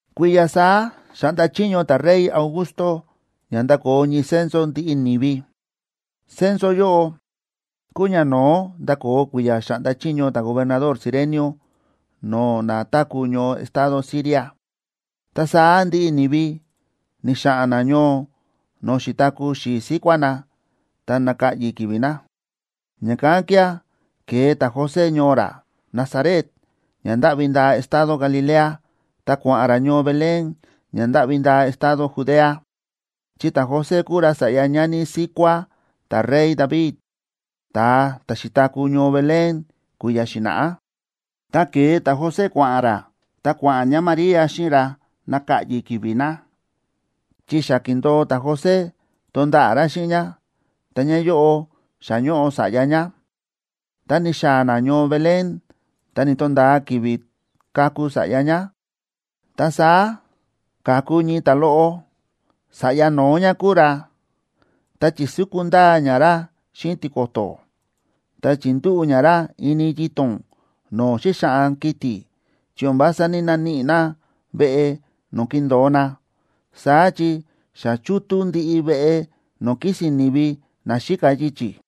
Kui̱ya̱ saá xa̱ꞌnda chiño ta̱rey Augusto ña ndakoo ñii censo ndiꞌi ni̱vi. Censo yóꞌo kúu ñano̱ó nda̱koo kui̱ya̱ xáꞌnda chiño ta̱gobernador Cirenio no̱o̱ na táku̱ ñoo estado Siria. Ta saá ndiꞌi ni̱vi ni̱xa̱ꞌa̱n na ñoo no̱o̱ xi̱taku̱ xi̱i̱ síkuá na, ta náka̱ꞌyi̱ ki̱vi̱ na. Ña̱kán kía̱ ke̱e ta̱José ñoo ra Nazaret ña ndáꞌvi ndaa estado Galilea, ta kua̱ꞌa̱n ra ñoo Belén ña ndáꞌvi ndaa estado Judea, chi ta̱José kúu ra sa̱ꞌya ñani síkuá ta̱rey David, ta̱a ta̱ xi̱taku̱ ñoo Belén kui̱ya̱ xi̱na̱ꞌá. Ta ke̱e ta̱José kua̱ꞌa̱n ra, ta kua̱ꞌa̱n ñáMaría xíꞌin ra naka̱ꞌyi̱ ki̱vi̱ na, chi xa ki̱ndo̱o ta̱José tonda̱ꞌa̱ ra xíꞌin ñá, ta ñáyóꞌo xa ñóꞌo sa̱ꞌya ñá. Ta ni̱xaa̱ na ñoo Belén, ta ni̱to̱nda̱a ki̱vi̱ kaku sa̱ꞌya ñá. Ta saá ka̱ku ñii ta̱a loꞌo, sa̱ꞌya no̱ó ñá kúu ra, ta chi̱súku ndaa ñá ra xíꞌin tiko̱to̱, ta chi̱ndúꞌu̱ ñá ra ini yito̱n no̱o̱ xíxaꞌan kiti̱, chi o̱n vása ní‑naníꞌi na veꞌe no̱o̱ kindo̱o na, saá chi xa chútú ndiꞌi veꞌe no̱o̱ kísi̱n ni̱vi na xíka yichi̱.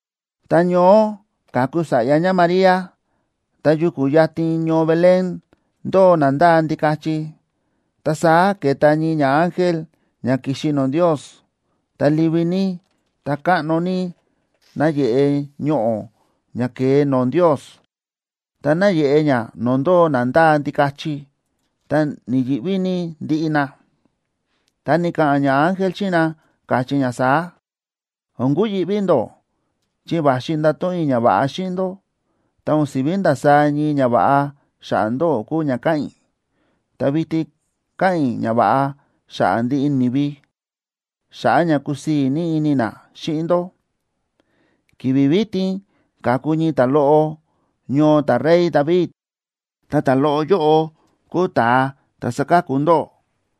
Tá ñoó ka̱ku sa̱ꞌya ñáMaría, ta yuku̱ yatin ñoo Belén, ndóo na ndáa ndikachi. Ta saá ke̱ta ñii ñaángel ña ki̱xi no̱o̱ Ndios, ta livi ní, ta káꞌno ní náyeꞌe ñoꞌo̱ ña ke̱e no̱o̱ Ndios, ta náyeꞌe ña no̱o̱ ndóo na ndáa ndikachi, ta ni̱yi̱ꞌví ní ndiꞌi na. Ta ni̱ka̱ꞌa̱n ñaángel xíꞌin na, káchí ña saá: ―O̱n kuyi̱ꞌví ndó, chi va̱xi i̱ ndato̱ꞌon i̱ ñava̱ꞌa xíꞌin ndó, ta o̱n si̱ví ndasaá ñii ñava̱ꞌa xa̱ꞌa̱ ndóꞌó kúu ña káꞌa̱n i̱, ta vitin káꞌa̱n i̱ ñava̱ꞌa xa̱ꞌa̱ ndiꞌi ni̱vi, xa̱ꞌa̱ ña kusii̱ ní ini na xíꞌin ndó. Ki̱vi̱ vitin ka̱ku ñii ta̱loꞌo ñoo ta̱rey David, ta ta̱loꞌo yóꞌo kúu Ta̱a ta̱ saka̱ku ndóꞌó.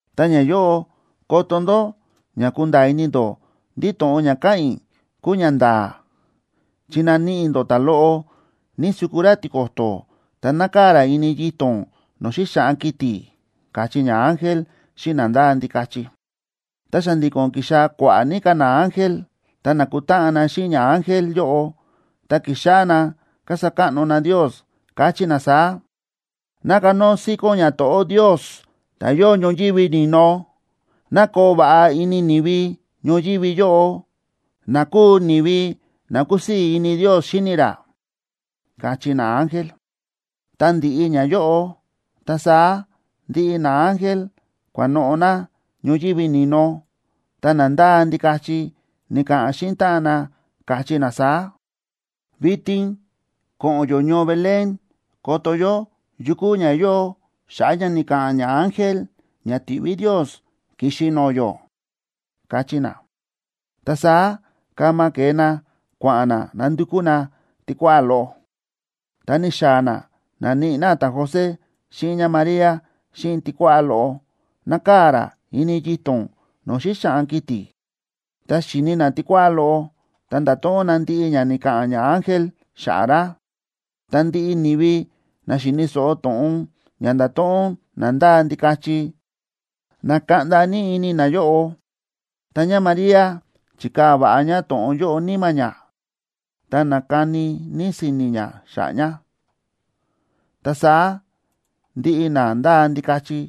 Ta ñayóꞌo koto ndó ña kunda̱a̱ ini ndó ndí to̱ꞌon ña káꞌa̱n i̱ kúu ñanda̱a̱, chi naníꞌi ndó ta̱loꞌo nísúku ra tiko̱to̱, ta nákaa̱ ra ini yito̱n no̱o̱ xíxaꞌan kiti̱ ―káchí ñaángel xíꞌin na ndáa ndikachi. Ta xa̱ndi̱ko̱n ki̱xaa̱ kua̱ꞌa̱ ní ka̱ naángel, ta na̱kutáꞌan na xíꞌin ñaángel yóꞌo. Ta ki̱xáꞌá na kasa káꞌno na Ndios, káchí na saá: ¡Ná kanóo síkón ñato̱ꞌó Ndios, ta̱ yóo ñoyívi ni̱no! Ná koo va̱ꞌa ini ni̱vi ñoyívi yóꞌo, na kúu ni̱vi na kúsii̱ ini Ndios xíni ra, káchí naángel. Tá ndi̱ꞌi ñayóꞌo, ta saá ndiꞌi naángel kua̱noꞌo̱ na ñoyívi ni̱no. Ta na ndáa ndikachi ni̱ka̱ꞌa̱n xíꞌin táꞌan na, káchí na saá: ―Vitin ko̱ꞌo̱n yó ñoo Belén koto yó yu kúu ña yóo xa̱ꞌa̱ ña ni̱ka̱ꞌa̱n ñaángel ña ti̱ꞌví Ndios ki̱xi no̱o̱ yó ―káchí na. Ta saá kama ke̱e na kua̱ꞌa̱n na nandukú na tikuáꞌá loꞌo, ta ni̱xaa̱ na na̱níꞌi na ta̱José xíꞌin ñáMaría xíꞌin tikuáꞌá loꞌo, nákaa̱ ra ini yito̱n no̱o̱ xíxaꞌan kiti̱. Tá xi̱ni na tikuáꞌá loꞌo, ta nda̱to̱ꞌon na ndiꞌi ña ni̱ka̱ꞌa̱n ñaángel xa̱ꞌa̱ ra. Ta ndiꞌi ni̱vi na xi̱ni̱ so̱ꞌo to̱ꞌon ña nda̱to̱ꞌon na ndáa ndikachi, na̱kaꞌnda ní ini nayóꞌo. Tá ñáMaría chi̱kaa̱ va̱ꞌa ñá to̱ꞌon yóꞌo níma̱ ñá, ta na̱kani ní si̱ni̱ ñá xa̱ꞌa̱ ña. Ta saá ndiꞌi na ndáa ndikachi,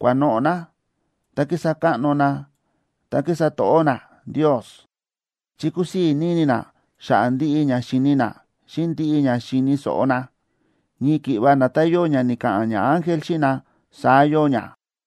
kua̱noꞌo̱ na, ta ki̱sa káꞌno na ta ki̱sa to̱ꞌó na Ndios, chi kúsii̱ ní ini na xa̱ꞌa̱ ndiꞌi ña xi̱ni na xíꞌin ndiꞌi ña xi̱ni̱ so̱ꞌo na. Ñii ki̱ꞌva nda̱tán yóo ña ni̱ka̱ꞌa̱n ñaángel xíꞌin na, saá yóo ña.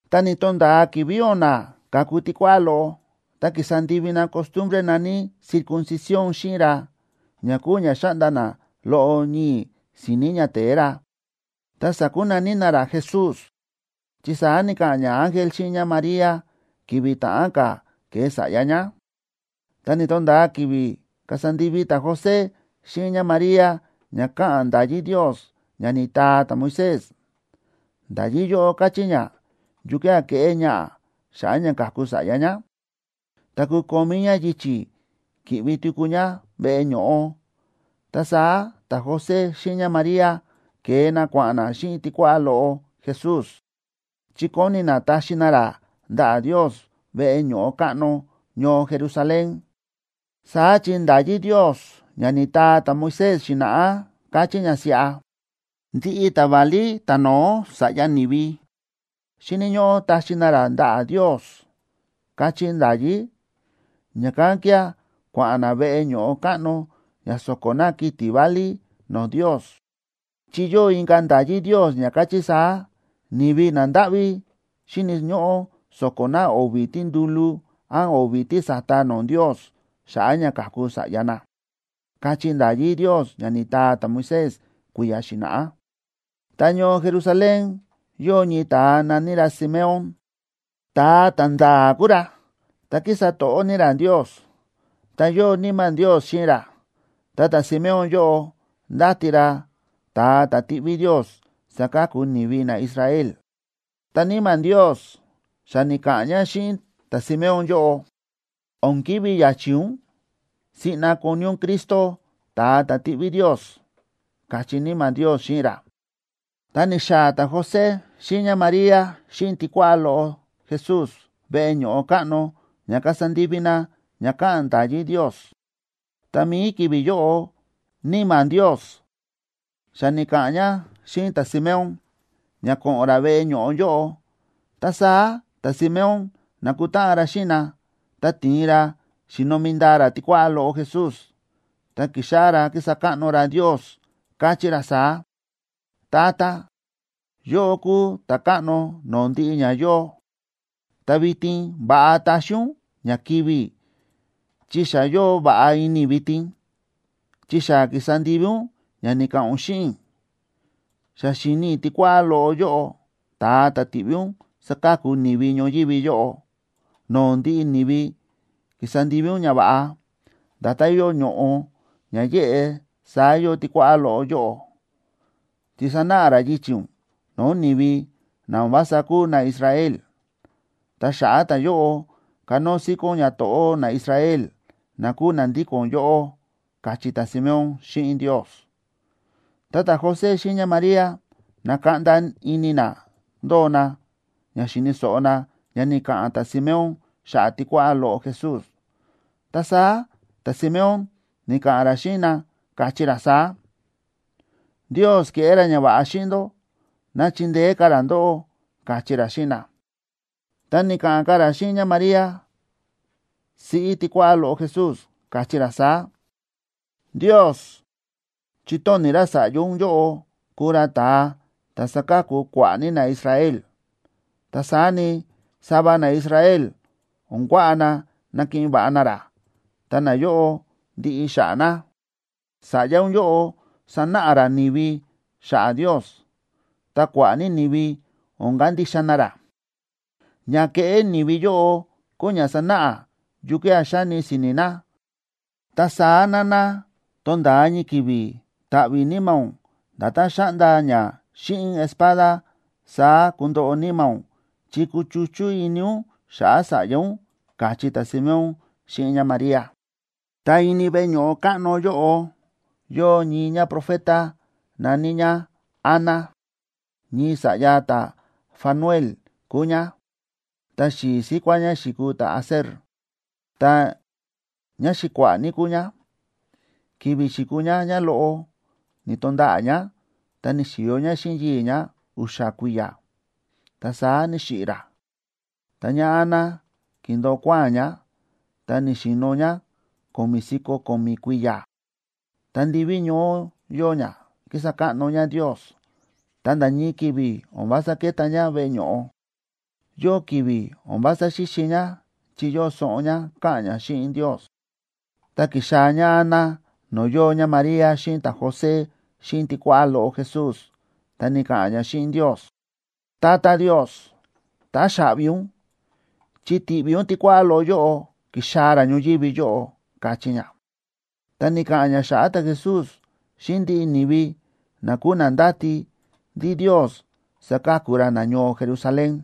Tá ni̱to̱nda̱a ki̱vi̱ o̱na̱ ka̱ku tikuáꞌá loꞌo, ta ki̱sa ndivi na costumbre na̱ní circuncisión xíꞌin ra, ña kúu ña xáꞌnda na loꞌo ñii̱ si̱ni̱ ñate̱e ra, ta sa̱kunaní na ra Jesús, chi saá ni̱ka̱ꞌa̱n ñaángel xíꞌin ñáMaría ki̱vi̱ ta̱ꞌán ka̱ ke̱e sa̱ꞌya ñá. Ta ni̱to̱nda̱a ki̱vi̱ kasa ndivi ta̱José xíꞌin ñáMaría ña káꞌa̱n nda̱yí Ndios ña ni̱taa ta̱Moisés. Nda̱yí yóꞌo káchí ña yukía̱ keꞌé ñaꞌa̱ xa̱ꞌa̱ ña ka̱ku sa̱ꞌya ñá, ta kukomí ñá yichi̱ ki̱ꞌvi tuku ñá veꞌe ño̱ꞌo. Ta saá ta̱José xíꞌin ñáMaría ke̱e na kua̱ꞌa̱n na xíꞌin tikuáꞌá loꞌo Jesús, chi kóni na taxi na ra ndaꞌa̱ Ndios veꞌe ño̱ꞌo káꞌno ñoo Jerusalén. Saá chi nda̱yí Ndios ña ni̱taa ta̱Moisés xi̱na̱ꞌá káchí ña siꞌa: “Ndiꞌi ta̱válí ta̱no̱ó sa̱ꞌya ni̱vi, xíni̱ ñóꞌó taxi na ra ndaꞌa̱ Ndios”, káchí nda̱yí. Ña̱kán kía̱ kua̱ꞌa̱n na veꞌe ño̱ꞌo káꞌno ña so̱ko̱ na kiti̱ válí no̱o̱ Ndios, chi yóo inka̱ nda̱yí Ndios ña káchí saá: “Ni̱vi nandáꞌví xíni̱ ñóꞌó so̱ko̱ na o̱vi̱ tíndúlú án o̱vi̱ tísa̱ta no̱o̱ Ndios xa̱ꞌa̱ ña ka̱ku sa̱ꞌya na”, káchí nda̱yí Ndios ña ni̱taa ta̱Moisés kui̱ya̱ xi̱na̱ꞌá. Ta ñoo Jerusalén, yóo ñii ta̱a na̱ní ra Simeón, ta̱a ta̱nda̱a̱ kúu ra, ta kísa to̱ꞌó ní ra Ndios, ta yóo Níma̱ Ndios xíꞌin ra. Ta ta̱Simeón yóꞌo ndáti ra ta̱a ta̱ tiꞌví Ndios saka̱ku ni̱vi naIsrael. Ta Níma̱ Ndios xa ni̱ka̱ꞌa̱n ña xíꞌin ta̱Simeón yóꞌo: ―O̱n kivi̱ ya̱chi̱ ún, siꞌna koni ún Cristo, ta̱a ta̱ tiꞌví Ndios ―káchí Níma̱ Ndios xíꞌin ra. Ta ni̱xaa̱ ta̱José xíꞌin ñáMaría xíꞌin tikuáꞌá loꞌo Jesús veꞌe ño̱ꞌo káꞌno ña kasa ndivi na ña káꞌa̱n nda̱yí Ndios. Ta mi̱i ki̱vi̱ yóꞌo, Níma̱ Ndios xa ni̱ka̱ꞌa̱n ña xíꞌin ta̱Simeón ña ko̱ꞌo̱n ra veꞌe ño̱ꞌo yóꞌo. Ta saá ta̱Simeón na̱kutáꞌan ra xíꞌin na, ta ti̱in ra xi̱nomi ndaa ra tikuáꞌá loꞌo Jesús, ta ki̱xáꞌá ra kísa káꞌno ra Ndios, káchí ra saá: Tata, yóꞌó kúu Ta̱káꞌno no̱o̱ ndiꞌi ña yóo. Ta vitin va̱ꞌa taxi ún ña kivi̱ i̱ chi xa yóo va̱ꞌa ini i̱ vitin, chi xa ki̱sa ndivi ún ña ni̱ka̱ꞌa̱n ún xíꞌin i̱. Xa xi̱ni i̱ tikuáꞌá loꞌo yóꞌo, ta̱a ta̱ ti̱ꞌví ún saka̱ku ni̱vi ñoyívi yóꞌo. No̱o̱ ndiꞌi ni̱vi ki̱sa ndivi ún ñava̱ꞌa. Nda̱tán yóo ñoꞌo̱ ña yéꞌe saá yóo tikuáꞌá loꞌo yóꞌo, chi sanáꞌa ra yichi̱ ún no̱o̱ ni̱vi na o̱n vása kúu naIsrael. Ta xa̱ꞌa̱ ta̱yóꞌo, kanóo síkón ñato̱ꞌó naIsrael na kúu na ndíko̱n yóꞌó, káchí ta̱Simeón xíꞌin Ndios. Ta ta̱José xíꞌin ñáMaría na̱kaꞌnda ini na ndóo na, ña xi̱ni̱ so̱ꞌo na ña ni̱ka̱ꞌa̱n ta̱Simeón xa̱ꞌa̱ tikuáꞌá loꞌo Jesús. Ta saá ta̱Simeón ni̱ka̱ꞌa̱n ra xíꞌin na, káchí ra saá: ―Ndios keꞌé ra ñava̱ꞌa xíꞌin ndó, ná chindeé ka̱ ra ndóꞌó ―káchí ra xíꞌin na. Ta ni̱ka̱ꞌa̱n ka̱ ra xíꞌin ñáMaría, siꞌí tikuáꞌá loꞌo Jesús, káchí ra saá: ―Ndios chi̱tóni̱ ra sa̱ꞌya ún yóꞌo kuu ra ta̱a ta̱ saka̱ku kua̱ꞌa̱ ní naIsrael. Ta saá ni, sava naIsrael o̱n kuaꞌa na nakiꞌin va̱ꞌa na ra, ta nayóꞌo ndiꞌi xa̱ꞌa̱ na. Sa̱ꞌya ún yóꞌo sanáꞌa ra ni̱vi xa̱ꞌa̱ Ndios, ta kua̱ꞌa̱ ní ni̱vi o̱n kandixa na ra. Ña kéꞌé ni̱vi yóꞌo kúu ña sanáꞌa yukía̱ xáni si̱ni̱ na. Ta saá, nana, tonda̱a ñii ki̱vi̱ ta̱ꞌvi̱ níma̱ ún; nda̱tán xa̱ꞌnda ña xíꞌin espada, saá kundoꞌo níma̱ ún, chi kuchuchú ini ún xa̱ꞌa̱ sa̱ꞌya ún ―káchí ta̱Simeón xíꞌin ñáMaría. Ta ini veꞌe ño̱ꞌo káꞌno yóꞌo yóo ñii ñáprofeta, na̱ní ñá Ana. Ñii sa̱ꞌya ta̱Fanuel kúu ñá, ta xi̱i̱ síkuá ñá xi̱kuu ta̱Aser, ta ñáxi̱kua̱ꞌa̱ ní kúu ñá. Ki̱vi̱ xi̱kuu ñá ñáloꞌo, ni̱to̱nda̱ꞌa̱ ñá, ta ni̱xi̱yo ñá xíꞌin yii̱ ñá u̱xa̱ kui̱ya̱, ta saá ni̱xiꞌi̱ ra. Ta ñáAna ki̱ndo̱o kuáa̱n ñá, ta ni̱xi̱no̱ ñá ko̱mi̱ si̱ko̱ ko̱mi̱ kui̱ya̱. Ta ndiví ñoó yóo ñá, kísa káꞌno ñá Ndios, ta nda̱ ñii ki̱vi̱ o̱n vása kéta ñá veꞌe ño̱ꞌo. Yóo ki̱vi̱ o̱n vása xíxi ñá chi yóo soꞌon ñá, káꞌa̱n ñá xíꞌin Ndios. Ta ki̱xaa̱ ñáAna no̱o̱ yóo ñáMaría xíꞌin ta̱José xíꞌin tikuáꞌá loꞌo Jesús, ta ni̱ka̱ꞌa̱n ñá xíꞌin Ndios: ―Tata Ndios, táxaꞌvi ún, chi ti̱ꞌví ún tikuáꞌá loꞌo yóꞌo ki̱xaa̱ ra ñoyívi yóꞌo ―káchí ñá. Ta ni̱ka̱ꞌa̱n ñá xa̱ꞌa̱ ta̱Jesús xíꞌin ndiꞌi ni̱vi na kúu na ndáti ndí Ndios saka̱ku ra nañoo Jerusalén.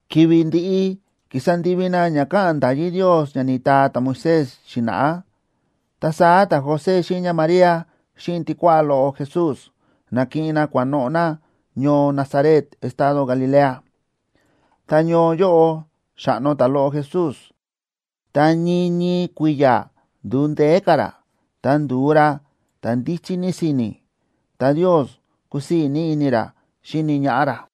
Ki̱vi̱ ndi̱ꞌi ki̱sa ndivi na ña káꞌa̱n nda̱yí Ndios ña ni̱taa ta̱Moisés xi̱na̱ꞌá, ta saá ta̱José xíꞌin ñáMaría xíꞌin tikuáꞌá loꞌo Jesús na̱kiꞌin na kua̱noꞌo̱ na ñoo Nazaret estado Galilea. Ta ñoo yóꞌo xa̱ꞌno ta̱loꞌo Jesús, ta ñii ñii kui̱ya̱ ndu̱u ndeé ka̱ ra. Ta ndu̱u ra ta̱ ndíchí ní si̱ni̱, ta Ndios kúsii̱ ní ini ra xíni ñaꞌá ra.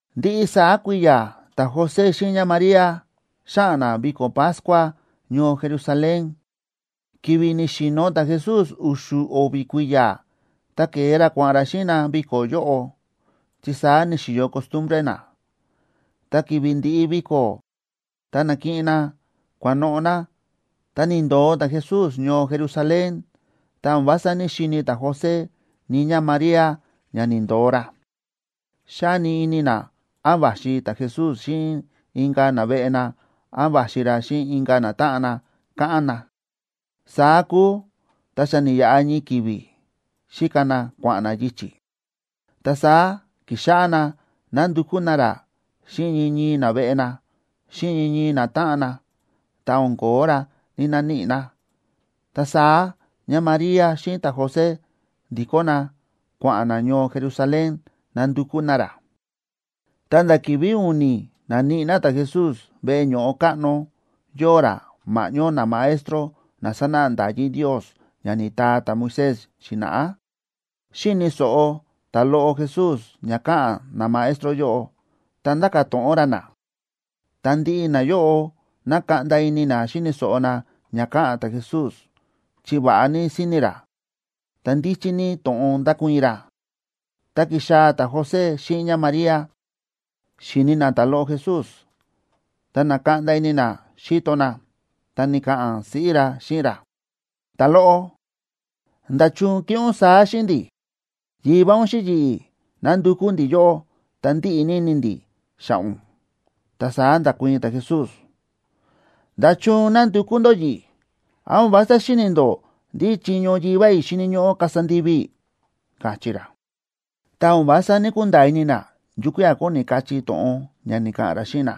Ndiꞌi saá kui̱ya̱ ta̱José xíꞌin ñáMaría xáꞌa̱n na viko̱ Pascuab ñoo Jerusalén. Ki̱vi̱ ni̱xi̱no̱ ta̱Jesús u̱xu̱ o̱vi̱ kui̱ya̱, ta ke̱e ra kua̱ꞌa̱n ra xíꞌin na viko̱ yóꞌo, chi saá ni̱xi̱yo costumbre na. Ta ki̱vi̱ ndi̱ꞌi viko̱, ta na̱kiꞌin na kua̱noꞌo̱ na, ta ni̱ndo̱o ta̱Jesús ñoo Jerusalén, ta o̱n vása ní‑xini̱ ta̱José ni ñáMaría ña ni̱ndo̱o ra. Xáni ini na án va̱xi ta̱Jesús xíꞌin inka̱ naveꞌe na án va̱xi ra xíꞌin inka̱ natáꞌan na, káꞌán na. Saá kúu, ta xa ni̱yaꞌa ñii ki̱vi̱ xíka na kua̱ꞌa̱n na yichi̱, ta saá ki̱xáꞌá na nándukú na ra xíꞌin ñii ñii naveꞌe na, xíꞌin ñii ñii natáꞌan na. Ta o̱n ko̱ó ra, ni̱‑naníꞌi na. Ta saá ñáMaría xíꞌin ta̱José ndi̱kó na kua̱ꞌa̱n na ñoo Jerusalén nandukú na ra. Ta nda̱ ki̱vi̱ u̱ni̱ na̱níꞌi na ta̱Jesús veꞌe ño̱ꞌo káꞌno, yóo ra ma̱ꞌñó namaestro na sánáꞌa nda̱yí Ndios ña ni̱taa ta̱Moisés xi̱na̱ꞌá. Xíni̱ so̱ꞌo ta̱loꞌo Jesús ña káꞌa̱n namaestro yóꞌo, ta ndáka̱ to̱ꞌon ra na. Ta ndiꞌi nayóꞌo na̱kaꞌnda ini na xíni̱ so̱ꞌo na ña káꞌa̱n ta̱Jesús chi va̱ꞌa ní si̱ni̱ ra, ta ndíchí ní to̱ꞌon nda̱kuii̱n ra. Ta ki̱xaa̱ ta̱José xíꞌin ñáMaría, xi̱ni na ta̱loꞌo Jesús, ta na̱kaꞌnda ini na xíto na, ta ni̱ka̱ꞌa̱n siꞌí ra xíꞌin ra: ―Ta̱loꞌo, ¿nda̱chun ke̱ꞌé ún saá xíꞌin ndi̱? Yivá ún xíꞌin yi̱ꞌi̱, na̱ndukú ndi̱ yóꞌó, ta ndíꞌi ní ini ndi̱ xa̱ꞌa̱ ún. Ta saá nda̱kuii̱n ta̱Jesús: ―¿Nda̱chun na̱ndukú ndó yi̱ꞌi̱? ¿Án o̱n vása xíni̱ ndó ndí chiño Yivá i̱ xíni̱ ñóꞌó kasa ndivi i̱? ―káchí ra. Ta o̱n vása ní‑kunda̱a̱ ini na yukía̱ kóni kachí to̱ꞌon ña ni̱ka̱ꞌa̱n ra xíꞌin na.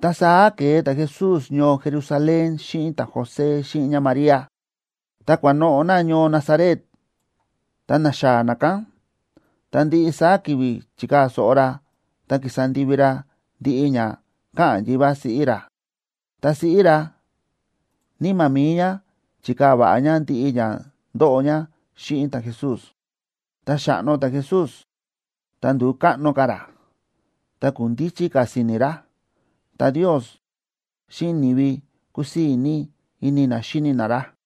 Ta saá ke̱e ta̱Jesús ñoo Jerusalén xíꞌin ta̱José xíꞌin ñáMaría, ta kua̱noꞌo̱ na ñoo Nazaret. Ta na̱xaa̱ na kán, ta ndiꞌi saá ki̱vi̱ chi̱kaa̱ so̱ꞌo ra ta ki̱sa ndivi ra ndiꞌi ña káꞌa̱n yivá ra xíꞌin siꞌí ra. Ta siꞌí ra, níma̱ mi̱i ñá chi̱kaa̱ va̱ꞌa ñá ndiꞌi ña ndóꞌo ñá xíꞌin ta̱Jesús. Ta xa̱ꞌno ta̱Jesús, ta ndu̱u káꞌno ka̱ ra, ta kúu ndíchí ka̱ si̱ni̱ ra. Ta Ndios xíꞌin ni̱vi kúsii̱ ní ini na xíni na ra.